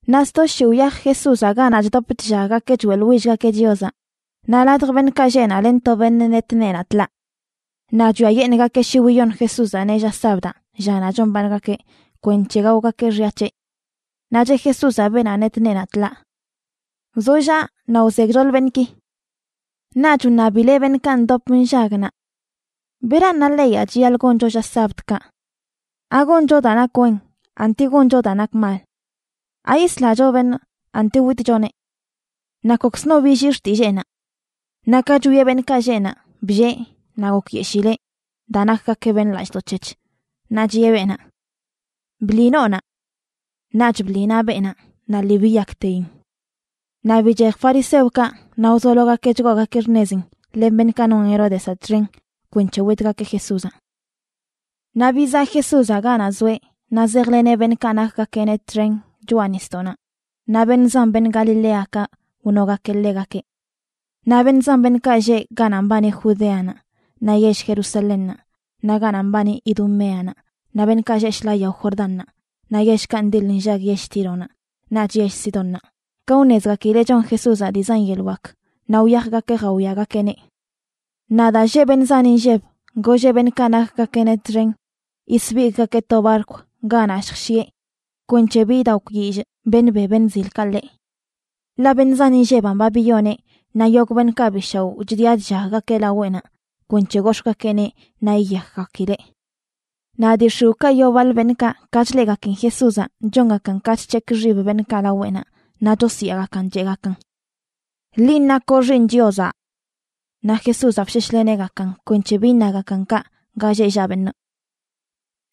Naꞌ sto shii wyaj Jesúzaꞌ ganaꞌ chdop chllaggakeꞌ choeꞌḻwillgakeꞌ Chiozaꞌ naꞌ ladj beṉꞌkaꞌ lleꞌ naꞌ len to beṉꞌ net neenaꞌ tḻaa. Naꞌ chwiayeṉꞌgakeꞌ shi wiyon Jesúzaꞌneꞌ lla sabdaꞌ, llanaꞌ chombaaṉgakeꞌ, kwenc̱he gaogakeꞌ xya c̱heꞌ. Naꞌ cheꞌ Jesúzaꞌ beenaꞌ net neenaꞌ tḻaa: ―Wzollaꞌ naꞌ wze gchoḻ beṉꞌki. Naꞌch wṉabileꞌ beṉꞌkaꞌ ndop nllag naꞌ: ―¿Beran na leyaꞌ chiyaḻꞌ goncho lla sabdkaꞌ? ¿Agoncho daa nak wen, anti goncho daa nak mal? ¿Ayislacho beṉꞌ, anti witchoneꞌ? Naꞌ kokzno billii xtilleenaꞌ. Naꞌ ka chwieꞌ beṉꞌkaꞌ lleꞌ naꞌ, bllee naꞌ gokyeshileꞌ daa nakgakeꞌ beṉꞌ lallꞌdoꞌ c̱hec̱h, naꞌ chiꞌe beenaꞌ: ―Bḻi noonaꞌ. Naꞌch bḻi naꞌ beenaꞌ naꞌ lii biyakteyin. Naꞌ bichej fariseokaꞌ naꞌ wzologakeꞌ chgoogakeꞌ xṉezin len beṉꞌkaꞌ non Heródezaꞌ txen kwenc̱he witgakeꞌ Jesúzaꞌ. Naꞌ bizaꞌ Jesúzaꞌ ganaꞌ zoeꞌ naꞌ zejleneꞌ beṉꞌkaꞌ nakgakeꞌneꞌ txen choꞌa nisdoꞌnaꞌ naꞌ beṉꞌ zan beṉꞌ Galiléakaꞌ wnogakeꞌ ḻegakeꞌ. Naꞌ beṉꞌ zan beṉꞌkaꞌ lleꞌ ganaꞌ mbani Judeanaꞌ, naꞌ yell Jerusalénnaꞌ, naꞌ ganaꞌ mbani Idumeanaꞌ, naꞌ beṉꞌkaꞌ lleꞌ shḻaa yao Jordánnaꞌ naꞌ yellkaꞌ ndiḻ nllag yell Tíronaꞌ naꞌch yell Sidónnaꞌ, ka wṉezgakileꞌ chon Jesúzaꞌ dii zan yeḻꞌ wak, naꞌ wyajgakeꞌ jawiagakeꞌneꞌ. Naꞌ daa lleꞌ beṉꞌ zan inlleb, golleꞌ beṉꞌkaꞌ nakgakeꞌneꞌ txen yisbigꞌgakeꞌ to barkw ganaꞌ lljshieꞌ kwenc̱he bi idakwyillꞌ beṉꞌ be beṉꞌ zilkaꞌ ḻeꞌ. Ḻaꞌ beṉꞌ zan inlleb ba biyoneꞌ naꞌ yogꞌ beṉꞌkaꞌ bi shaoꞌ chdiꞌa chllaggakeꞌ laweꞌnaꞌ kwenc̱he gox̱ꞌgakeꞌneꞌ naꞌ yiyakgakileꞌ. Naꞌ dii x̱iwꞌkaꞌ yoo baḻ beṉꞌkaꞌ, ka chleꞌgakin Jesúzaꞌ, chongakan ka chc̱hekꞌ xib beṉꞌkaꞌ laweꞌnaꞌ naꞌ chosyaagakan, cheꞌgakan: ―¡Linꞌ nakoꞌ Xiiṉ Chiozaꞌ! Naꞌ Jesúzaꞌ bsheshleneꞌgakan kwenc̱he bi iṉagakan kaꞌ ga lleꞌ llaꞌ beṉꞌ.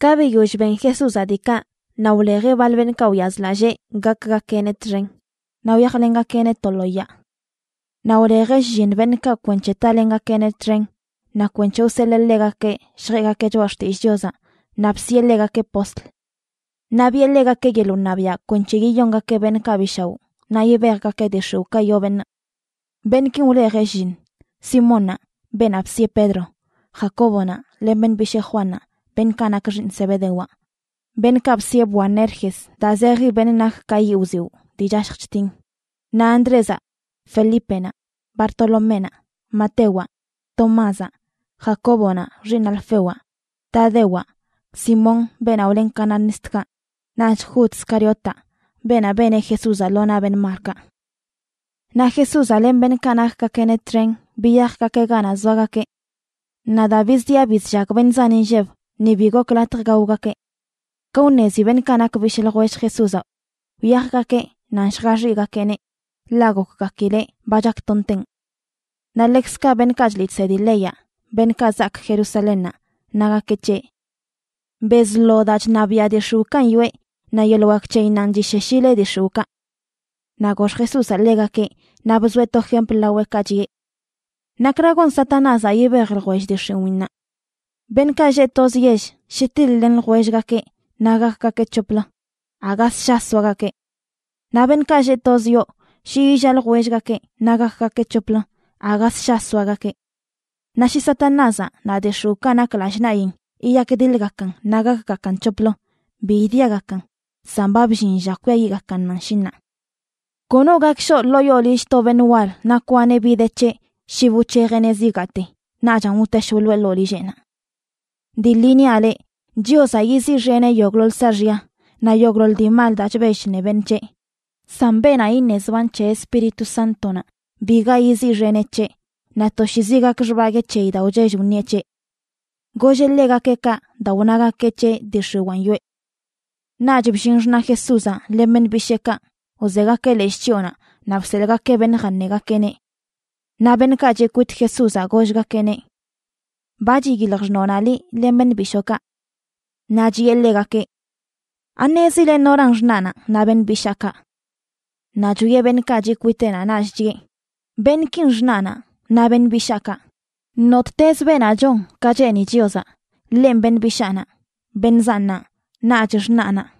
Ka biyoll ben Jesúzaꞌ diikaꞌ, naꞌ wlejeꞌ baḻ beṉꞌkaꞌ wyazlallee gakgakeꞌneꞌ txen naꞌ wyajlengakeꞌneꞌ to lo yaa. Naꞌ wlejeꞌ shlliṉ beṉꞌkaꞌ kwenc̱he talengakeꞌneꞌ txen naꞌ kwenc̱he wseḻee ḻegakeꞌ lljeꞌgakeꞌ choꞌa xtillꞌ Chiozaꞌ, naꞌ bsiꞌe ḻegakeꞌ postl. Naꞌ biꞌe ḻegakeꞌ yeḻꞌ wṉabiaꞌ kwenc̱he yiyongakeꞌ beṉꞌkaꞌ bi shaoꞌ naꞌ yibejgakeꞌ dii x̱iwꞌkaꞌ yoo beṉꞌ. Beṉꞌkin wlejeꞌ shlliṉ: Simónnaꞌ, beenaꞌ bisiꞌe Pedro; Jacóbonaꞌ len beṉꞌ bishee Juannaꞌ, beṉꞌkaꞌ nak xiiṉ Zebedewaꞌ, (beṉꞌkaꞌ bsiꞌe Boanerges, daa zeji beṉꞌ nak ka yiꞌ wziwꞌ dii chashj chtin); naꞌ Andrézaꞌ, Felípenaꞌ, Bartoloménaꞌ, Matewaꞌ, Tomázaꞌ, Jacóbonaꞌ, xiiṉ Alfewaꞌ, Tadewaꞌ, Simón, beenaꞌ wlen cananistkaꞌ, naꞌch Jud Scariotaꞌ, beenaꞌ beneꞌ Jesúzaꞌ lo naꞌ beṉꞌ malkaꞌ. Naꞌ Jesúzaꞌ len beṉꞌkaꞌ nakgakeꞌneꞌ txen biyajgakeꞌ ganaꞌ zoagakeꞌ. Naꞌ daa bizdiꞌa bizllag beṉꞌ zan inlleb, ni bi gok latj gaogakeꞌ. Ka wṉezi beṉꞌkaꞌ nak bishꞌ ljwell Jesúzaꞌ, wyajgakeꞌ nan lljaxiꞌgakeꞌneꞌ, ḻaꞌ gokgakileꞌ ba chaktonteꞌn. Naꞌ ḻekzkaꞌ beṉꞌkaꞌ chliꞌ chsedi leyaꞌ, beṉꞌkaꞌ zaak Jerusalénnaꞌ, nagakeꞌ c̱heꞌ: ―Bezlo daa chṉabiaꞌ dii x̱iwꞌkanꞌ yoꞌe, naꞌ yeḻꞌ wak c̱heyinnanꞌ chisheshileꞌ dii x̱iwꞌkaꞌ. Naꞌ gox Jesúzaꞌ ḻegakeꞌ naꞌ bzoeꞌ to jempl laweꞌkaꞌ, chiꞌe: ―¿Nakra gon Satanázaꞌ yibej ljwell dii x̱iwiinnaꞌ? Beṉꞌkaꞌ lleꞌ toz yell shi tiḻ-len ljwellgakeꞌ naꞌ gakgakeꞌ c̱hoplə, aga ssha soagakeꞌ. Naꞌ beṉꞌkaꞌ lleꞌ toz yoo shi illaa ljwellgakeꞌ naꞌ gakgakeꞌ c̱hoplə, aga ssha soagakeꞌ. Naꞌ shi Satanázaꞌ naꞌ dii x̱iwꞌkaꞌ nak lallꞌ naꞌyin yiyakdiḻgakan naꞌ gakgakan c̱hoplə, bi idiagakan, san ba bllin lla kwiayiꞌgakannanꞌ, shi ṉaa. ’Kono gak shoꞌ ḻoo yoo lill to beṉꞌ wal naꞌ kwaneꞌ bi de c̱heꞌ shi bi wc̱hejeꞌneꞌ zigaate, naꞌchan wtesh wḻoeꞌ ḻoo lilleꞌnaꞌ. ’Dii ḻi niaꞌ leꞌ, Chiozaꞌ yiziꞌxeneꞌ yogꞌḻoḻ saaxya naꞌ yogꞌḻoḻ dii mal daa chbell chṉe beṉꞌ c̱heꞌ; san beenaꞌ iṉe zban c̱he Espíritu Sántonaꞌ, biga yiziꞌxeneꞌ c̱heꞌ, naꞌ toshiizi gak xbaguee c̱heyi daa wchell wṉieꞌ c̱heꞌ. Golleꞌ ḻegakeꞌ kaꞌ daa wnagakeꞌ c̱heꞌ dii x̱iwaan yoꞌe. Naꞌch bllin xṉaꞌ Jesúzaꞌ len beṉꞌ bisheekaꞌ, wzegakeꞌ leshꞌ chyoonaꞌ naꞌ bseḻꞌgakeꞌ beṉꞌ jaṉegakeꞌneꞌ. Naꞌ beṉꞌkaꞌ chiꞌ kwit Jesúzaꞌ gollgakeꞌneꞌ: ―Ba chiyilj xṉoonaꞌ liꞌ len beṉꞌ bishookaꞌ. Naꞌ chiꞌe ḻegakeꞌ: ―¿Aṉezile noran xṉaꞌnaꞌ naꞌ beṉꞌ bishaakaꞌ? Naꞌ chwieꞌ beṉꞌkaꞌ chiꞌ kwiteꞌnaꞌ naꞌch chiꞌe: ―Beṉꞌkin xṉaꞌnaꞌ naꞌ beṉꞌ bishaakaꞌ. Nottezə beenaꞌ chon ka cheeni Chiozaꞌ, ḻenꞌ beṉꞌ bishaanaꞌ, beṉꞌ zannaꞌ naꞌch xṉaꞌnaꞌ.